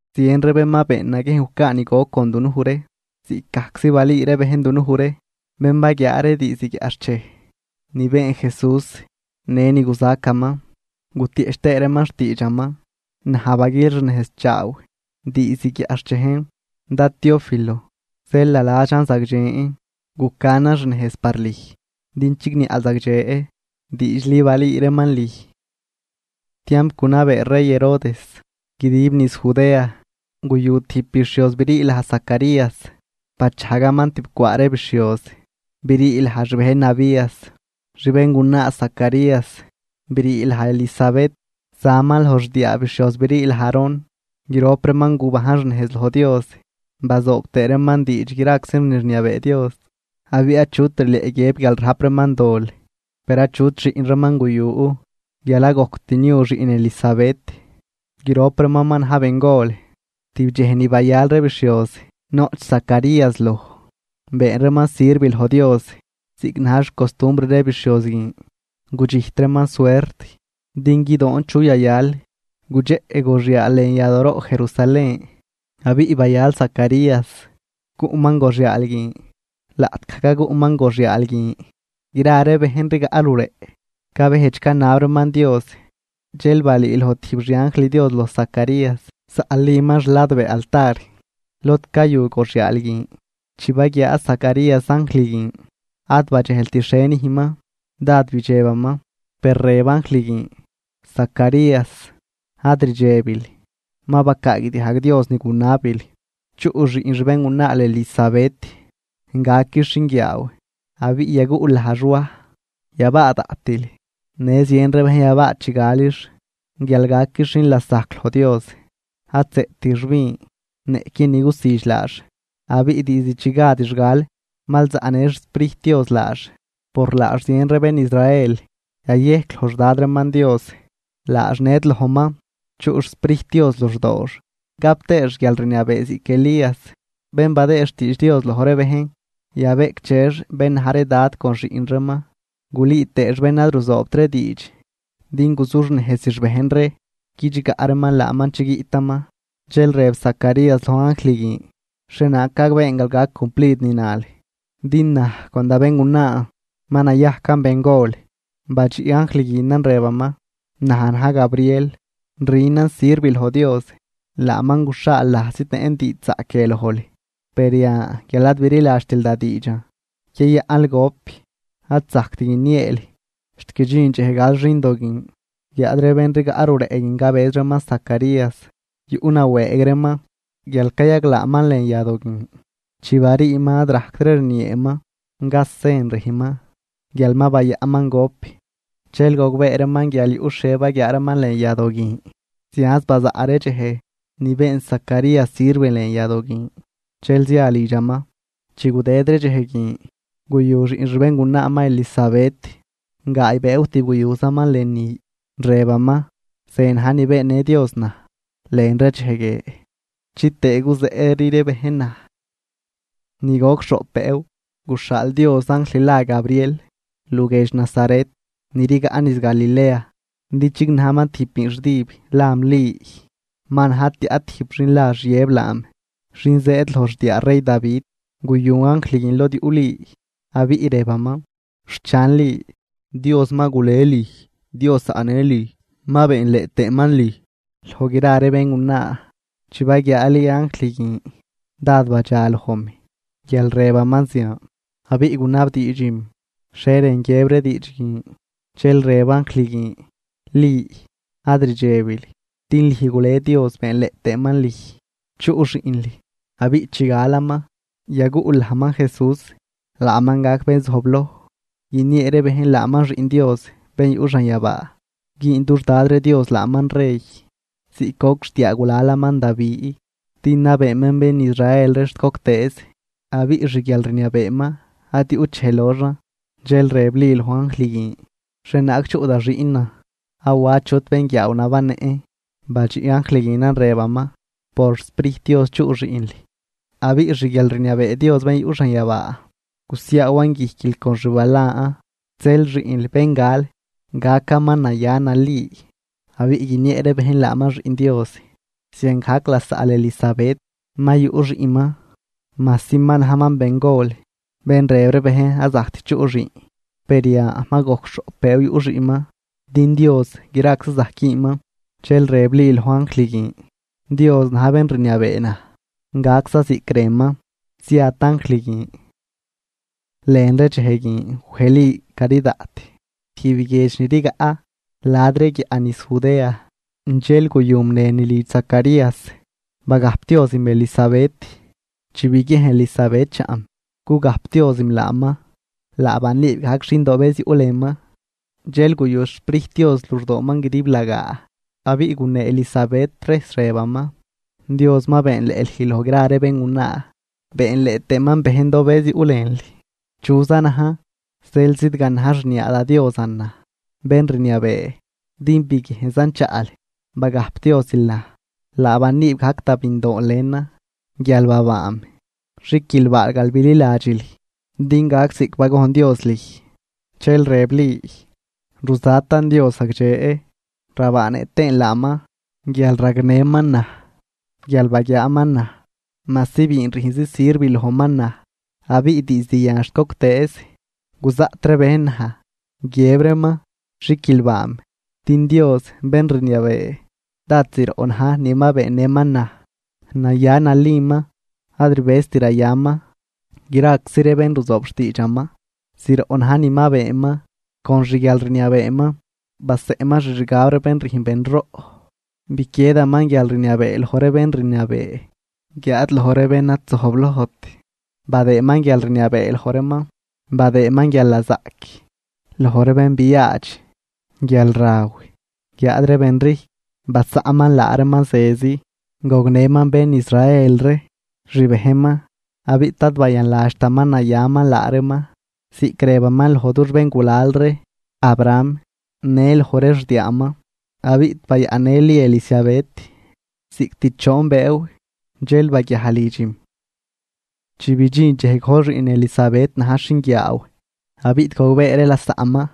Zien ree bén ma been naguiejn gucaa ni goc con dunuj ree, ziꞌcgajczi balüü ree bejn dunuj ree, bén baguiaa ree diizd guiaꞌxchej ni been Jesús në ni guzacaman, gutieꞌch tëë reeman xtiidxaman. Naj baguilxnejzchaaw diizd guiaꞌxchejn, dad Teófilo, zeel naladxan zagdxen gucanan xnejz par lüj, din chigniaꞌl zagdxe diidxli balüü reeman lüj. Tiamp gunabee rey Herodes guidib niz Judea, guyu tijb bixhioz brii laj Zacarías, bachajgaman tib cwaa ree bixhioz brii laj xbejn Abías. Xbéngunaa Zacarías brii laj Elisabet, zaman loj xdiaa bixhioz brii laj Aarón. Grop reeman gubajn xnejz loj Dios bazoob tëë reeman diidx graczi ni rniabee Dios, abiꞌ achut rileꞌ guiëb guial rajp reeman dol. Per achut xiꞌn reeman guyu guial ad gojct niu xiꞌn Elisabet, grop reeman ma na̱j bengol. Tijb dxej ni bayal ree bixhioz noꞌch Zacarías loj, been reeman sirv loj Dios, ziꞌc na̱j xcostumbr ree bixhioz guin, gudxijt reeman suert din guidoon chu yayal gudxeꞌ goxyaal lën yadooroꞌ Jerusalén, abiꞌ bayal Zacarías cuꞌman goxyaal guin. Laꞌtgaj caguꞌman goxyaal guin, gra ree bejn rigaꞌ luleꞌ cabejdx canab reeman Dios. Dxel balüüloj tijb xianjl Dios loj Zacarías, zaꞌliman xladbee altar lod cayu goxyaal guin. Chi baguiaa Zacarías anjl guin, ad badxejlt xhie nüjnman, dád bidxebaman. Per rëb anjl guin: ―Zacarías, ad rdxebil ma bacaagdiajg Dios ni gunabil. Chuꞌ xiꞌn xbéngunaal Elisabet, gaquix xinguiaaw abiꞌ yaguꞌl lajx Waj. Yabaa daꞌtil, në zien ree bejn yabaa chi galix, guial gaquix xin lasajc loj Dios. Ad zëꞌtix vin niꞌqui ni gusüdx laax. Abiꞌ diizd chi gadix gal mal zaꞌnë xSprijt Dios laax. Por laax zien ree bén Israel yayejc loj xDad reeman Dios. Laax ned lojman, chuꞌ xSprijt Dios luxdoox gap tëëx guialrniabee ziꞌc Elías, bén badëë xtiidx Dios loj ree bejn, yabeꞌcdxex bén na̱j ree dad con xiꞌn reeman, gulüü tëëx bén ad ruzoobt ree diidx din guzuxnejzix bejn ree guidxgaꞌ reeman laaman chi guiꞌtaman. Dxel rëb Zacarías loj anjl guin: ―¿Xhienaag gagbeen guial gac cumplid ni nal? Din naj con da béngunaan ma nayajcan bengol. Badxiꞌ anjl guinan rëbaman: ―Naj na̱j Gabriel, rünan sirv loj Dios, laaman guxhaal naj zidnëꞌn diidxzaꞌc guie lojl. Per yan guial ad bililadxtil da diidxan, yayaꞌnl gop ad zajct guinieel xt guidxin dxej gal xindo guin. Guiáad ree ben rigaꞌ luleꞌ guin cabëz reeman Zacarías yuꞌ nawëëg reeman guial cayaglaaman lën yadoo guin. Chi bariiman ad rajctri rnieeman, gaz sen rüjnman guial ma bayaꞌnman gop. Dxel gogbee reeman guial yuꞌ xhie baguiaaman lën yadoo guin. Zianz bazaꞌ ree dxej ni been Zacarías sirv lën yadoo guin, dxel zia lidxaman. Chi gudëd ree dxej guin, guyu xiꞌn xbéngunaaman Elisabet. Gaay bëëw tib guyuzaman lënü, rëbaman: “Ze na̱j ni beennë Dios naj lën ree dxej guie chitëë guzeꞌri ree bejn naj.” Ni goc xhoꞌp bëëw, guxhaal Dios anjl la Gabriel luguiedx Nazaret ni rigaꞌ niz Galilea, din chignajman tijb biinxdüb lam Li. Ma na̱j tiaꞌ tijb xin la Xiëb laam, xin zëëd loj xdiaa rey Davi. Guyu anjl guin lod yuꞌ Li abiꞌ rëbaman: ―¡Xchan Li, Dios ma gulej lüj! Dios zaꞌnë lüj, ma beenleꞌ tëëman lüj loj gra ree béngunaa. Chi baguiaa Li anjl guin dád badxa lojm guial rëbaman zian, abiꞌ gunabdiidxim xhie rën guiëb ree diidx guin. Dxel rëb anjl guin: ―Li, ad rdxebil din lüj gule Dios beenleꞌ tëëman lüj. Chuꞌ xiꞌnl, abiꞌ chi galaman yaguꞌl lajman JESÚS. Laaman gac bén zojbloj, guiniee ree bejn laaman Xiꞌn Dios bén yuꞌ xanyabaa. Güün dux Dad ree Dios laaman rey ziꞌc goc xdiaagulalaman Davi, din nabeeman bén Israel ree xt goctëëz, abiꞌ xguialrniabeeman ad yuꞌt dxej loxan. Dxel rëb Li loj anjl guin: ―¿Xhienaag chuꞌ da xiꞌnan awa achut bénguiaaw nabannëꞌn? Badxiꞌ anjl guinan rëbaman: ―Por xSprijt Dios chuꞌ xiꞌnl, abiꞌ xguialrniabee Dios bén yuꞌ xanyabaa gusiaawan guijquil con xbalan. Zeel xiꞌnl bén gal, gacaman naya nali abiꞌ guiniee ree bejn laaman Xiꞌn Dios. Ziangajc lasaꞌl Elisabet ma yuꞌ xiꞌnman, majsi ma najman bengol, bén rëb ree bejn ad zajct chuꞌ xiꞌn, per yan ma gojc xhoꞌp bëëw yuꞌ xiꞌnman. Din Dios graczi zajc güünman. Dxel rëb Li loj anjl guin: ―Dios na̱j bén rniabee naj, gacza ziꞌc rënman. Ziat anjl guin. Lën ree dxej guin wej Li cari daꞌt tijb guiedx ni rigaꞌ la̱d ree guiaꞌ niz Judea, dxel guyum lënü lidx Zacarías, bagajpdiozim Elisabet. Chi biguiejn Elisabet chaꞌm cugajpdiozim laaman, laa baniib gajc xindobëz yuꞌ lënman, dxel guyu xSprijt Dios luxdooman guidiblagaa. Abiꞌ gunee Elisabet rejs, rëbaman: ―¡Dios ma beenleꞌ lüj loj gra ree béngunaa, beenleꞌ tëëman bejndobëz yuꞌ lënl! ¿Chuza najn zeel zidganaj xniaa da Diosan naj, bén rniabee? Din biguiejnzan chaꞌl bagajpdiozil naj, laa baniib gajc da bindoon lënan guial babaam. Xiquilbaal guial bililadxil, din gac ziꞌc bagojn Dios lüj. Dxel rëb Li: Ruzatan Dios zagdxe, rabaanëꞌ tëën laaman, guial ragnëman naj. Guial baguiaaman naj, majsi biin rüjnzi sirv lojman naj. Abiꞌ diizd yan xt goctëëz guzaꞌt ree bejn naj, guiëb reeman xiquilbaam. Din Dios, bén rniabee, dád zroꞌ na̱j ni ma beennëman naj. Naya naliman. Ad rbëzt rayaman graczi ree bén ruzoob xtiidxaman. Zroꞌ na̱j ni ma beenman con xguialrniabeeman. Baseꞌnman xixgab ree bén rüjn benroꞌ, biquiedaman guialrniabee loj ree bén rniabee, guiáad loj ree bén ad zojblojt badëëman guialrniabee loj reeman. Badëëman guialnazaꞌc loj ree bén biaadx guialraw, guiáad ree benrijcw basaꞌnman laa reeman zezi. Gognëman bén Israel ree, xbejnman, abiꞌ ad bayanladxtaman nayaman laa reeman, ziꞌc rëbaman loj dux béngulal ree, Abraham në loj ree xdiaaman. Abiꞌ bayaꞌnnë Li Elisabet cost choon bëëw, dxel baguiaj lidxim. Chi bidxin dxej gojl xiꞌn Elisabet najx xinguiaaw. Abiꞌ gogbee ree lasaꞌman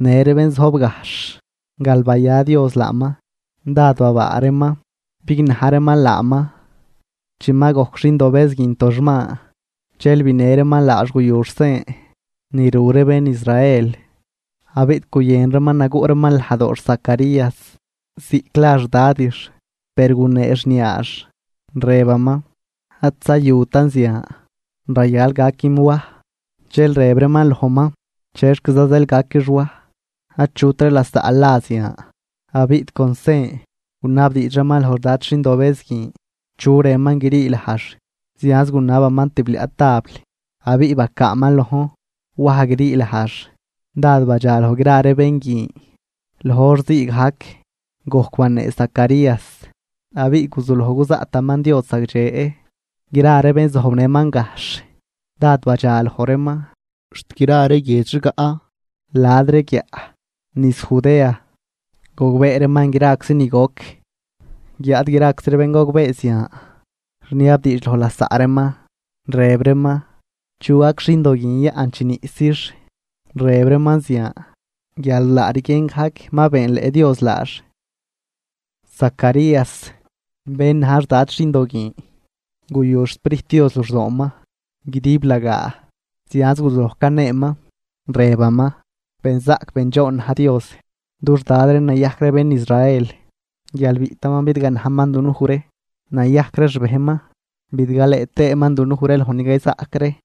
në ree bén zojb gajxh guial baya Dios laaman, dád babaa reeman bignaj reeman laaman. Chi ma gojc xindobëz guin toxman, dxel binë reeman laax guyux sen ni ru ree bén Israel. Abiꞌ guyën reeman naguꞌ reeman lajdoox Zacarías ziꞌc la xdadix, per gunee xniaax, rëbaman: ―Ad zayutan zian. Rayal gaquim Waj. Dxel rëb reeman lojman: ―¿Chexquiza zeel gaquix Waj? Achut ree lasaꞌl la zian. Abiꞌ con sen gunabdiidx reeman loj xdad xindobëz guin chu rënman grii lajx. Zianz gunabaman tibliaꞌ tabl abiꞌ bacaaman lojn: “Waj grii lajx.” Dád badxaloj gra ree bén guin. Loj hor ziigajc gojc banee Zacarías, abiꞌ guzuloj cuzaꞌtaman Dios zagdxe. Gra ree bén zojbnëman gajxh dád badxa loj reeman, xt gra ree guiedx rigaꞌ la̱d ree guiaꞌ niz Judea gogbee reeman graczi ni goc. Guiáad graczi ree bén gogbee zian, rniabdiidx loj lasaꞌ reeman, rëb reeman: ―¿Chu gac xindo guin yaꞌn chi niꞌsix? Rëb reeman zian guial laa rguien gajc ma beenleꞌ Dios laax. Zacarías, bén na̱j xdad xindo guin guyu xSprijt Dios luxdooman guidiblagaa, zianz guzuloj caneeman, rëbaman: Benzaꞌc bendxoon na̱j Dios, dux Dad ree nayajc ree bén Israel, guial biꞌtaman bidganajman dunuj ree nayajc ree xbejnman, bidgalëë tëëman dunuj ree loj ni cayzaꞌc ree.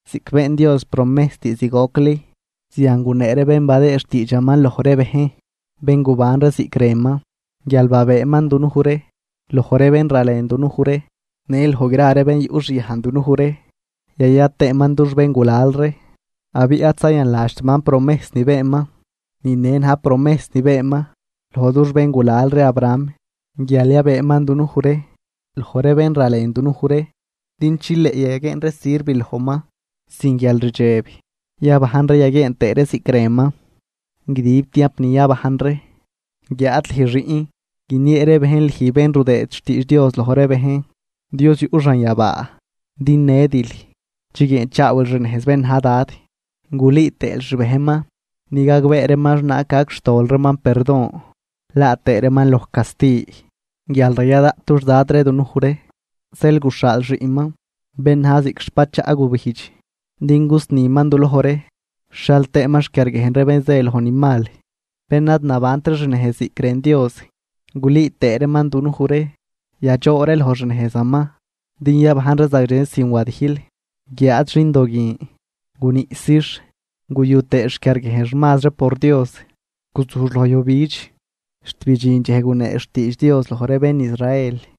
Ziꞌc been Dios promejs diizd gocli, zian gunee ree bén badëë xtiidxaman loj ree bejn, bén guban ree ziꞌc rënman: guial yabëëman dunuj ree loj ree bén ralen dunuj ree, në loj gra ree bén yuꞌxyajn dunuj ree, yaya tëëman dux béngulal ree, abiꞌ ad zayanladxtaman promejs ni beenman. Ni ne na̱j promejs ni beenman loj dux béngulal ree Abraham: guial yabëëman dunuj ree loj ree bén ralen dunuj ree, din chileꞌ yaguieen ree sirv lojman sin guialrdxeb, yabajn ree yaguieen tëë ree ziꞌc rënman, guidib tiamp ni yabajn ree. Guiáad lüj xiꞌn, guiniee ree bejn lüj bén rudëë xtiidx Dios loj ree bejn, Dios yuꞌ xanyabaa. Din nedil chiguieenchaawil xnejz bén na̱j Dad, gulüü tëël xbejnman din gagbee reeman xhienaag gac xtol reeman perdon, laa tëë reeman loj casti. Guial raya daꞌt dux Dad ree dunuj ree, zeel guxhaal xiꞌnman, bén na̱j ziꞌc xbachaꞌ gubijdx din gusniman du loj ree, guixhial tëëman xquiarguiejn ree bén zë loj nejzmal, bén ad nabant ree xnejz ziꞌc rën Dios, gulüü tëëman dunuj ree yadxoo ree loj xnejzaman din yabajn ree zagdxe sin wadijl. Guiáad xindo guin guniꞌsix guyu tëë xquiarguiejnx mazri por Dios. Guzujx loj yujbidx, xt bidxin dxej guneex xtiidx Dios loj ree bén Israel.